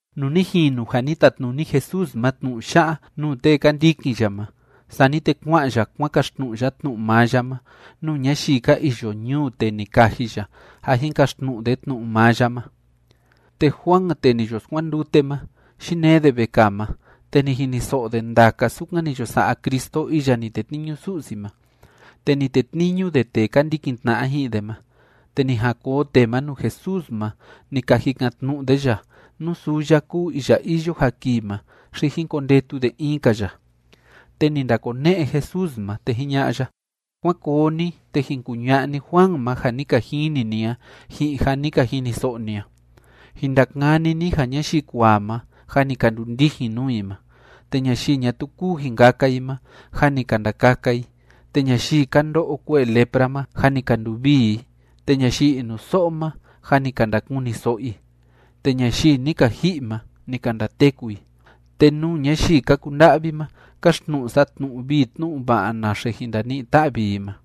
Nuu ni jinu ja ni tatnuni Jesús ma tnu'u ya'a nuu tee ka ndikin ya ma, sani te kua'an ya kuan kaxtnu'u ya tnu'u maa ya ma nuu ñayii ka iyo ñuu tee ni kaji ya ja jin kaxtnu'u de tnu'u maa ya ma. Te Juan tee ni yo skuandute ma, yinee de vekaa ma, te ni jiniso'o de ndaka sukan ni yo sa'a Cristo iya ni tetniñu Su'si ma, te ni tetniñu de tee ka ndikin tna'a ji'in de ma, te ni jan koo tee ma nuu Jesús ma ni ka jikan‑tnu'u de ya nú suu ya kúu iya iyo ja kii ma xi jín kondetu de in‑ka ya. Te ni ndakone'e Jesús ma, te jiña'a ya: ―Kuán koo ni, te jin kuña'a ni Juan ma ja ni ka jini ni a ji'in ja ni ka jiniso'o ni a. Jin ndakani ni ja ñayii kuaa ma, jâ ni ka ndundijin nuu i ma, te ñayii ñatuu kúu jin kaka i ma, jâ ni ka ndakaka i, te ñayii ka ndo'o kue'e lepra ma, jâ ni ka nduvii i, te ñayii inuso'o ma, jâ ni ka ndakuniso'o i, te ñayii ni ka ji'i ma, ni ka ndateku i, te nuu ñayii ka kunda'vi ma, káxtnu'u sa tnu'u vii tnu'u va'a naxe jin ndani'i‑ta'vi i ma.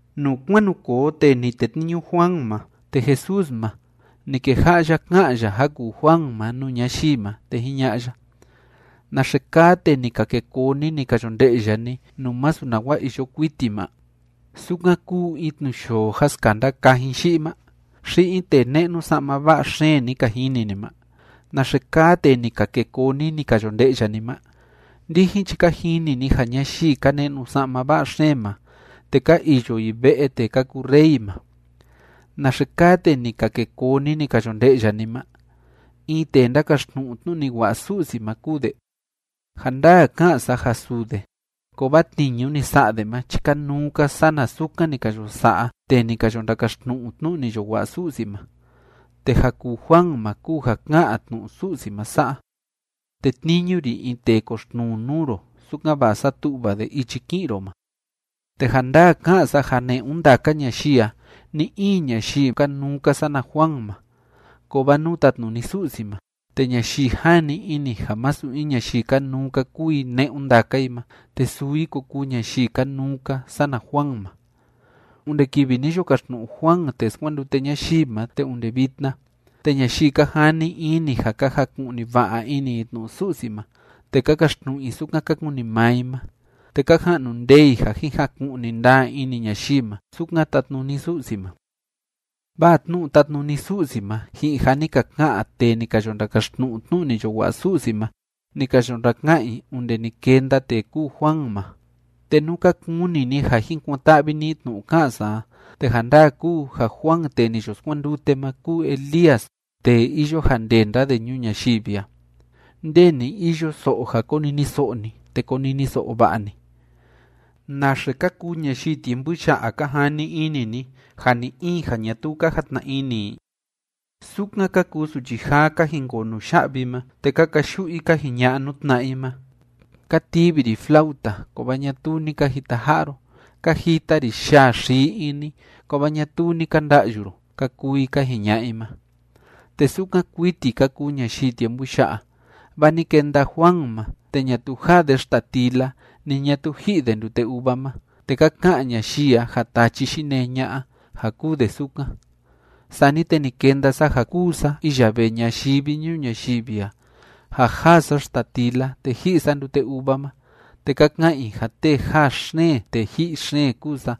Nuu kuan nu koo tee ni tetniñu Juan ma, te Jesús ma, ni keja'a ya ká'an ya ja kuu Juan ma nuu ñayii ma, te jiña'a ya: ―¿Naxe kaa tee ni ka ke koo ni, ni ka yo nde'ya ni nuu masu nawa iyo kuiti ma? ¿Sukan kúu in tnuyoo ja skanda kajin yi'i ma? ¿Xi in tee ne'nu sa'ma va'a xeen ni ka jini ni ma? ¿Naxe kaa tee ni ka ke koo ni, ni ka yo nde'ya ni ma? Ndijin chi ka jini ni ja ñayii ka ne'nu sa'ma va'a xeen ma, te ka iyo i ve'e tee ka kuu rey ma. ¿Naxe kaa tee ni ka ke koo ni, ni ka yo nde'ya ni ma? ¿In tee ndákaxtnu'u tnu'u ni wa'a Su'si ma kúu de? Ja ndaa ká'an sa ja suu de, kovaa tniñu ni sa'a de ma chi kanuu‑ka sana sukan ni ka yo sa'a tee ni ka yo ndakaxtnu'u tnu'u ni yo wa'a Su'si ma. Te ja kuu Juan ma kúu ja ká'an tnu'u Su'si ma sa'a: Tetniñu ri in tee koxtnuu nuu ro, sukan‑va'a satu'va de ichi ki'in ro ma. ’Te ja ndaa ká'an sa ja ne'un ndaka ñayii a, ni‑in ñayii kanuu‑ka sana Juan ma, kovaa nuu tatnuni Su'si ma, te ñayii jani ini ja masu in ñayii kanuu‑ka kúu i ne'un ndaka i ma, te suu i ko kuu ñayii kanuu‑ka sana Juan ma. ’Onde kivi ni yo kaxtnu'u Juan tee skuandute ñayii ma te onde vitna, te ñayii ka jani ini ja ka jaku'ni va'a ini i tnu'u Su'si ma, te ka kaxtnu'u i sukan ka kuni maa i ma, te ka ja'nu ndee i ja jin jaku'ni ndaa ini ñayii ma sukan tatnuni Su'si ma. Vaa tnu'u tátnuni Su'si ma ji'in ja ni ka ka'an tee ni ka yo ndakaxtnu'u tnu'u ni yo wa'a Su'si ma, ni ka yo ndaka'an i onde ni kenda tee kúu Juan ma. Te nú ka kuni ni ja jin kuan‑ta'vi ni tnu'u ka'an sa a, te ja ndaa kúu ja Juan tee ni yo skuandute ma kúu Elías tee iyo ja ndenda de ñuu ñayivi a. Nde ni iyo so'o ja koniniso'o ni, te koniniso'o va'a ni. ’¿Naxe ka kuu ñayii tiempu ya'a, ka jani ini ni, ja ni‑in ja ñatuu ka jatna ini i? Sukan ka kuu suchi jaa ka jinkoo nuya'vi ma, te ka kayu'u i ka jiña'a nuu tna'a i ma: “Ka tivi ri flauta, kovaa ñatuu ni ka jitaja'a ro. Ka jita ri yaa xii ini, kovaa ñatuu ni ka nda'yu ro”, ka kuu i ka jiña'a i ma, te sukan kuiti ka kuu ñayii tiempu ya'a. Vaa ni kenda Juan ma, te ñatuu jaa de xtatila ni ñatuu ji'i de ndute uva ma, te ka ka'an ñayii a ja tachi yinee ña'a, ja kúu de sukan. Sani te ni kenda sa ja kúu sa iya vee ñayivi ñuu ñayivi a ja jaa sa xtatila te ji'i sa ndute uva ma, te ka ka'an i ja tee jaa xeen tee ji'i xeen kúu sa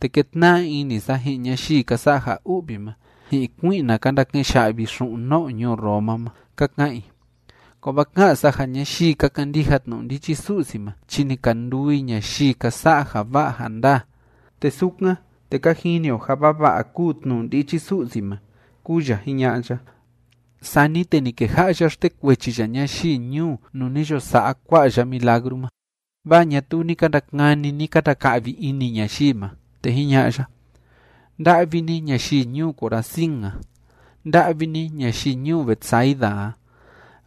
te kétna'a ini sa ji'in ñayii ka sa'a ja u'vi ma ji'in kui'na ka ndake'en ya'vi xu'un no'o ñuu Roma ma, ka ka'an i. Kovaa ká'an sa ja ñayii ka kandija tnu'u ndichi Su'si ma chi ni ka nduu i ñayii ka sa'a ja va'a ja ndaa. Te sukan, te ka jini o ja vava'a kúu tnu'u ndichi Su'si ma ―kúu ya jiña'a ya. Sani te ni keja'a ya xtekuechi ya ñayii ñuu nuu ni yo sa'a ya kua'a milagru ma, vaa ñatuu ni ka ndakani, ni ka ndaka'vi ini ñayii ma, te jiña'a ya: ―¡Nda'vi ni ñayii ñuu Corazín a! ¡Nda'vi ni ñayii ñuu Betsaida a!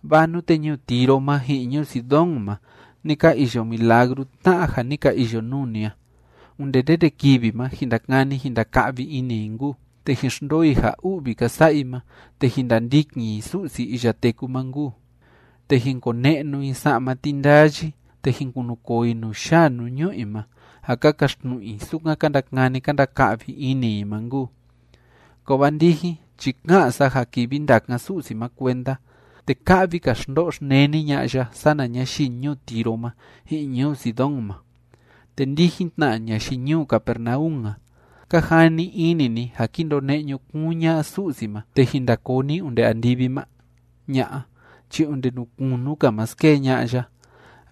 Vaa nute ñuu Tiro ma ji'in ñuu Sidón ma ni ka iyo milagru tna'a ja ni ka iyo nuu ni a, onde ndende kivi ma jin ndakani jin ndaka'vi ini i nkuu, te jin xndoo i ja u'vi ka sa'a i ma te jin ndandikin i Su'si iya teku ma nkuu, te jin kone'nu i sa'ma tindayi, te jin kunukoo i nuu yaa nuu ñu'u i ma ja ka kaxtnu'u i sukan ka ndakani ka ndaka'vi ini i ma nkuu. Kovaa ndijin chi ká'an sa ja kivi ndakan Su'si ma kuenda, te ka'vi‑ka xndo'o xneni ña'a ya sana ñayii ñuu Tiro ma ji'in ñuu Sidón ma. Te ndijin tna, ñayii ñuu Capernaum a, ¿ka jani ini ni ja ki ndone'e ñukuun ña'a Su'si ma te jin nda koo ni onde andivi ma? ¡Ña'a chi onde nuu kunu‑ka ma skee ña'a ya!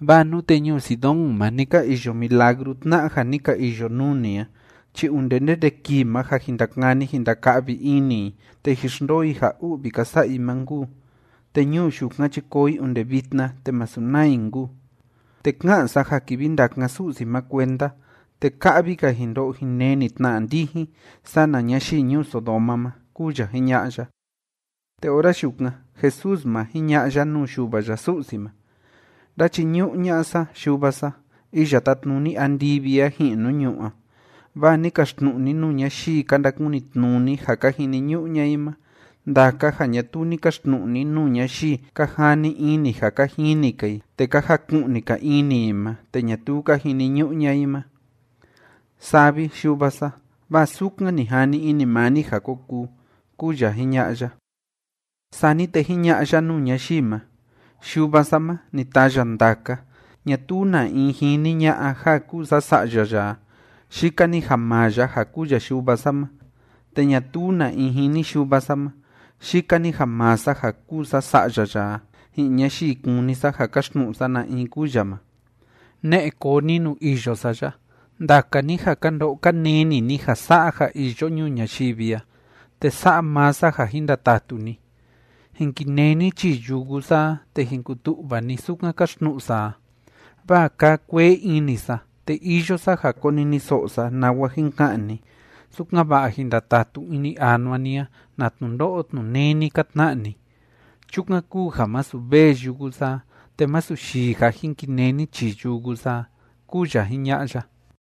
Vaa nute ñuu Sidón ma ni ka iyo milagru tna'a ja ni ka iyo nuu ni a chi onde ndende kii ma ja jin ndakani jin ndaka'vi ini i te jin xndoo i ja u'vi ka sa'a i ma nkuu, te ñuu yukan chi koo i onde vitna, te masu naa i nkuu. Te ká'an sa ja kivi ndakan Su'si ma kuenda, te ka'vi‑ka jin ndo'o jin neni tna ndijin sana ñayii ñuu Sodoma ma ―kúu ya jiña'a ya. Te ora yukan Jesús ma, jiña'a ya nuu Yuva ya Su'si ma: ―Ndáchiñu'u ña'a sa, Yuva sa, iya tátnuni andivi a ji'in nuu ñu'ú a, vaa ni kaxtnu'u ni nuu ñayii ka ndakunitnuni ja ka jiniñu'u ña'a i ma ndaka ja ñatuu ni kaxtnu'u ni nuu ñayii ka jani ini ja ka jini‑ka i te ka jaku'ni‑ka ini i ma te ñatuu ka jiniñu'u ña'a i ma. Saa vi, Yuva sa, vaa sukan ni jani ini maa ni ja ko kuu ―kúu ya jiña'a ya. Sani te jiña'a ya nuu ñayii ma: ―Yuva sa ma, ni taa ya ndaka. Ñatuu na in jini ña'a ja kúu sa Sa'ya ya a, yika‑ni ja maa ya ja kúu ya Yuva sa ma. Te ñatuu na in jini Yuva sa ma, yika‑ni ja maa sa ja kúu sa Sa'ya ya a, ji'in ñayii kúni sa ja kaxtnu'u sa na in kúu ya ma. ’Ne'e koo ni nuu iyo sa ya, ndaka ni ja ka ndo'o ka neni ni ja sa'a ja iyo ñuu ñayivi a, te sa'a maa sa ja jin ndatatu ni. Jin kinee ni chii yugu sa a, te jin kutu'va ni sukan káxtnu'u sa a, vaa kaa kuee ini sa, te iyo sa ja koniniso'o sa nawa jin ka'an ni, sukan‑va'a jin ndatatu ini anua ni a na tnundo'o tnuneni ka tna'a ni. Chukan kúu ja masu vee yugu sa a, te masu yii ja jin kinee ni chii yugu sa a ―kúu ya jiña'a ya.